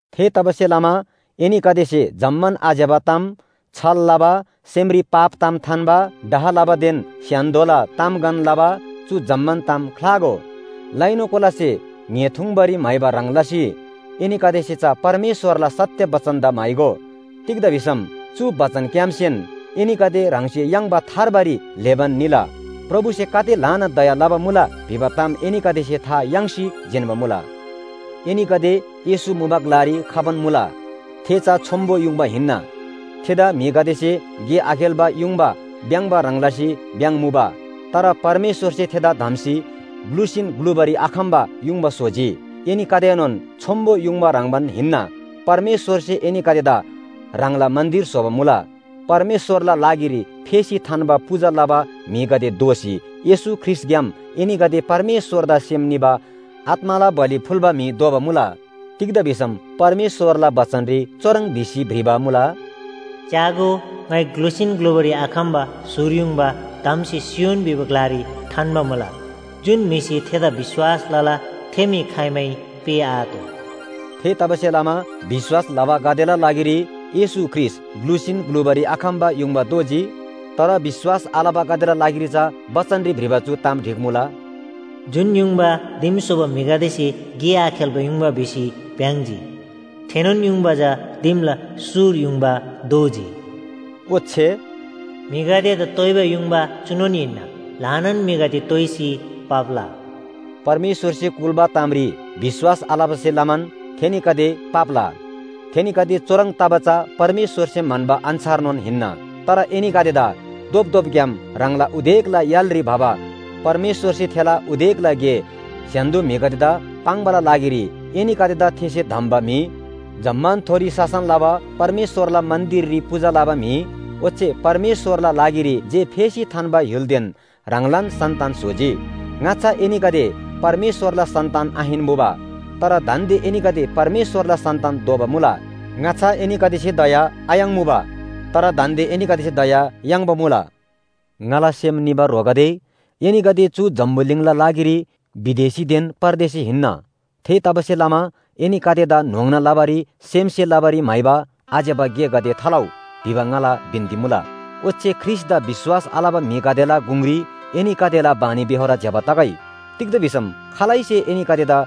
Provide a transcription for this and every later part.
थेतबासेलमा एनीगदेसे जम्‍मान आज्‍यबा ताम, छल लबा, सेमरी पाप ताम थान्‍बा, डाह लबादेन स्‍य्‍हान्‍दोला तामगन लबा चु जम्‍मान ताम ख्‍लागो। लैनु कोलासे ङ्‍हे थुङ्बारी म्‍हाइबा ह्रङ् लसी एनीगदेसे चा परमेश्‍वरला सत्‍य बचनदा म्‍हाइगो। तिग्‍दा भिसम चु बचनग्‍यामसेन एनीगदे ह्राङसे याङ्बा थार्बारी ल्‍हेबान निला। प्रभुसे गाते ल्‍हाना दया लबा मुला भिबा ताम एनीगदेसे था याङ्सी जिन्‍बा मुला। एनीगदे येशू मुबा ग्‍लारी खबान मुला, थे चा छोन्‍बो युङबा हिन्‍ना। थेदा म्‍हिगदेसे गे आखेल्‍बा युङबा भ्‍याङ्‍बा ह्रङ् लसी भ्‍याङ्मुबा। तर परमेश्‍वरसे थेदा धम्‍सी ग्‍लुसीन ग्‍लुबारी आखम्‍बा युङबा स्‍होजी। एनीगदेएनोन छोन्‍बो युङबा ह्रङ्‌बान हिन्‍ना, परमेश्‍वरसे एनीगदेदा ह्राङला मन्‍दिर स्‍होबा मुला। परमेश्‍वरला लागिरी फेसी थान्‍बा पूजा लबा म्‍हिगदे दोःसी येशू ख्रीष्‍टग्‍याम एनीगदे परमेश्‍वरदा सेम निबा आत्‍माला बलि फुल्‍बा म्‍हि दोबा मुला। तिग्‍दा भिसम परमेश्‍वरला बचनरी चुह्रङ् भिसी भ्रिबा मुला, “च्‍यागो, ङाइ ग्‍लुसीन ग्‍लुबारी आखम्‍बा सुर युङबा धम्‍सी सियोन भिबा ग्‍लारी थान्‍बा मुला। जुन म्‍हिसे थेदा विश्‍वास लला थे म्‍हि खाइमै पेःआतोः।” थेतबासेलमा विश्‍वास लबागदेला लागिरी येशू ख्रीष्‍ट ग्‍लुसीन ग्‍लुबारी आखम्‍बा युङबा दोजी। तर विश्‍वास आलबागदेला लागिरी चा बचनरी भ्रिबा चु ताम ढिक्‍मुला, “जुन युङबा दिम स्‍होबा म्‍हिगदेसे गे आखेल्‍बा युङबा भिसी भ्‍याङ्‍जी, थेनोन युङबा चा दिमला सुर युङबा दोजी।” ओच्‍छे “म्‍हिगदेदा तोइबा युङबा चुनोन हिन्‍ना। ल्‍हानान म्‍हिगदे तोइसी पाप्‍ला।” परमेश्‍वरसे कुल्‍बा तामरी विश्‍वास आलबासे लमान थेनीगदे पाप्‍ला। थेनीगदे चुह्रङ् तबा चा परमेश्‍वरसे म्‍हन्‍बा अन्‍छारनोन हिन्‍ना। तर एनीगदेदा धोपधोपग्‍याम ह्राङला उदेकला य्‍हालरी भबा परमेश्‍वरसे थेला उदेकला गे स्‍य्‍हान्‍दो म्‍हिगदेदा पाङ्‌बाला लागिरी एनीगदेदा थेसे धम्‍बा म्‍हि, जम्‍मानथोरी शासन लबा परमेश्‍वरला मन्‍दिररी पूजा लबा म्‍हि, ओच्‍छे परमेश्‍वरला लागिरी जे फेसी थान्‍बा य्‍हुलदेन ह्राङलान सन्‍तान स्‍होजी। ङाच्‍छा एनीगदे परमेश्‍वरला सन्‍तान आहिन्‍मुबा। तर दान्‍दे एनीगदे परमेश्‍वरला सन्‍तान दोबा मुला। ङाच्‍छा एनीगदेसे दया आयाङ्‌मुबा। तर दान्‍दे एनीगदेसे दया याङ्बा मुला। ङाला सेम निबा ह्रोगदे, एनीगदे चु जम्‍बुलिङला लागिरी विदेशीदेन परदेशी हिन्‍ना। थेतबासेलमा एनीगदेदा न्‍होङ्ना लबारी, सेमसे लबारी म्‍हाइबा आज्‍यबा गेगदे थालउ भिबा ङाला बिन्‍ती मुला। ओच्‍छे ख्रीष्‍टदा विश्‍वास आलबा म्‍हिगदेला गुङरी एनीगदेला बानीबेहोर ज्‍यबा तगै। तिग्‍दा भिसम खालैसे एनीगदेदा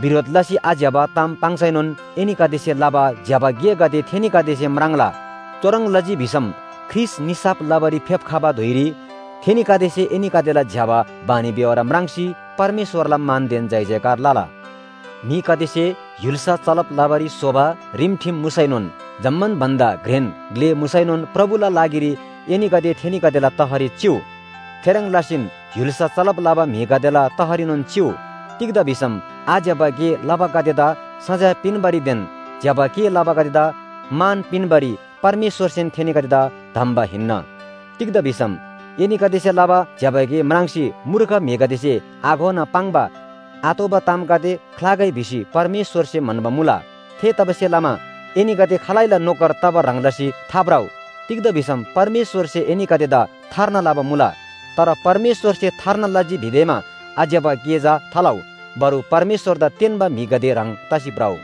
बिरोध लसी आज्‍यबा ताम पाङ्सैनोन एनीगदेसे लबा ज्‍यबा गेगदे थेनीगदेसे म्राङ्ला। चुह्रङ् लजी भिसम ख्रीष्‍ट निसाफ लबारी फेप्‍खबा धुइरी थेनीगदेसे एनीगदेला ज्‍यबा बानीबेहोर म्राङ्सी परमेश्‍वरला मानदेन जयजयकार लला। म्‍हिगदेसे य्‍हुल्‍सा चलब लबारी स्‍होबा रिमठिम मुसैनोन जम्‍मान भन्‍दा घ्रेन ग्‍ले मुसैनोन प्रभुला लागिरी एनीगदे थेनीगदेला तहरी चिउ। थेह्रङ् लसीन य्‍हुल्‍सा चलब लबा म्‍हिगदेला तहरीनोन चिउ। तिग्‍दा भिसम आज्‍यबा गे लबागदेदा सजाय पिन्‍बारीदेन ज्‍यबा गे लबागदेदा मान पिन्‍बारी परमेश्‍वरसेन थेनीगदेदा धम्‍बा हिन्‍ना। तिग्‍दा भिसम एनीगदेसे लबा ज्‍यबा गे म्राङ्सी मूर्ख म्‍हिगदेसे आघोना पाङ्बा आतोःबा तामगदे ख्‍लागै भिसी परमेश्‍वरसे म्‍हन्‍बा मुला। थेतबासेलमा एनीगदे खालैला नोकर तबा ह्रङ् लसी थाभ्रउ, तिग्‍दा भिसम परमेश्‍वरसे एनीगदेदा थार्ना लबा मुला। तर परमेश्‍वरसे थार्ना लजी भिदेमा आज्‍यबा गे चा थालउ। बरु परमेश्‍वरदा तेन्‍बा म्‍हिगदे ह्रङ् तसी भ्रउ।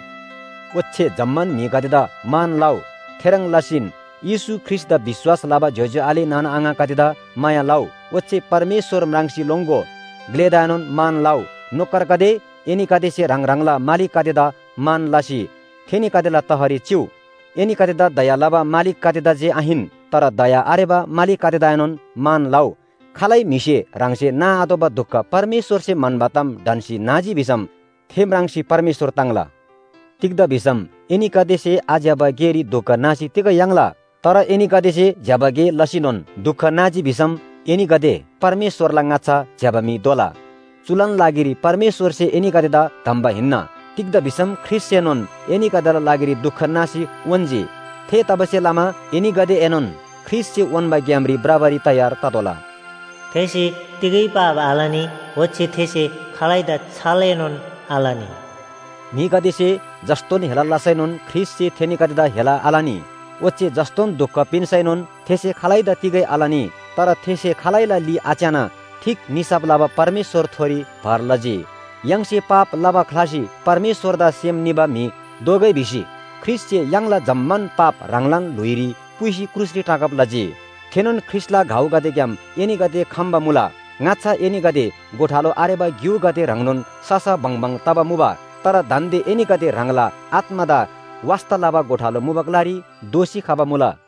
ओच्‍छे जम्‍मान म्‍हिगदेदा मान लउ। थेह्रङ् लसीन येशू ख्रीष्‍टदा विश्‍वास लबा ज्‍योज्‍यो आले नाना आङागदेदा माया लउ। ओच्‍छे परमेश्‍वर म्राङ्सी लोङ्‍गो। ग्‍लेदाएनोन मान लउ। नोकरगदे, एनीगदेसे ह्राङ ह्राङला मालिकगदेदा मान लसी थेनीगदेला तहरी चिउ। एनीगदेदा दया लबा मालिकगदेदा जे आहिन, तर दया आरेबा मालिकगदेदाएनोन मान लउ। खालै म्‍हिसे ह्राङसे नाआतोःबा दुख परमेश्‍वरसे म्‍हन्‍बा ताम ढन्‍सी नाजी भिसम थे म्राङ्सी परमेश्‍वर ताङ्ला। तिग्‍दा भिसम एनीगदेसे आज्‍यबा गेरी दुख नासी तिग याङ्ला? तर एनीगदेसे ज्‍यबा गे लसीनोन दुख नाजी भिसम एनीगदे परमेश्‍वरला ङाच्‍छा ज्‍यबा म्‍हि दोला। चुलान लागिरी परमेश्‍वरसे एनीगदेदा धम्‍बा हिन्‍ना। तिग्‍दा भिसम ख्रीष्‍टसेनोन एनीगदेला लागिरी दुख नासी उन्‍जी। थेतबासेलमा एनीगदेएनोन ख्रीष्‍टसे उन्‍बा ग्‍यामरी भ्रबारी तयार ततोःला। “थेसे तिगै पाप आलनी, ओच्‍छे थेसे खालैदा छलएनोन आलनी।” म्‍हिगदेसे जस्‍तोन हेला लसैनोन ख्रीष्‍टसे थेनीगदेदा हेला आलनी। ओच्‍छे जस्‍तोन दुख पिन्‍सैनोन थेसे खालैदा तिगै आलनी। तर थेसे खालैला ली आच्‍याना ठीक निसाफ लबा परमेश्‍वरथोरी भर लजी। य्‍हाङसे पाप लबा ख्‍लासी परमेश्‍वरदा सेम निबा म्‍हि दोगै भिसी ख्रीष्‍टसे य्‍हाङला जम्‍मान पाप ह्राङलान ल्‍हुइरी पुइसी क्रुसरी टाँगब लजी। थेनोन ख्रीष्‍टला घाउगदेग्‍याम एनीगदे खम्‍बा मुला। ङाच्‍छा एनीगदे गोठालो आरेबा ग्‍युगदे ह्रङ्नोन ससा बङबङ तबा मुबा। तर दान्‍दे एनीगदे ह्राङला आत्‍मादा वास्‍ता लबा गोठालो मुबा ग्‍लारी दोःसी खबा मुला।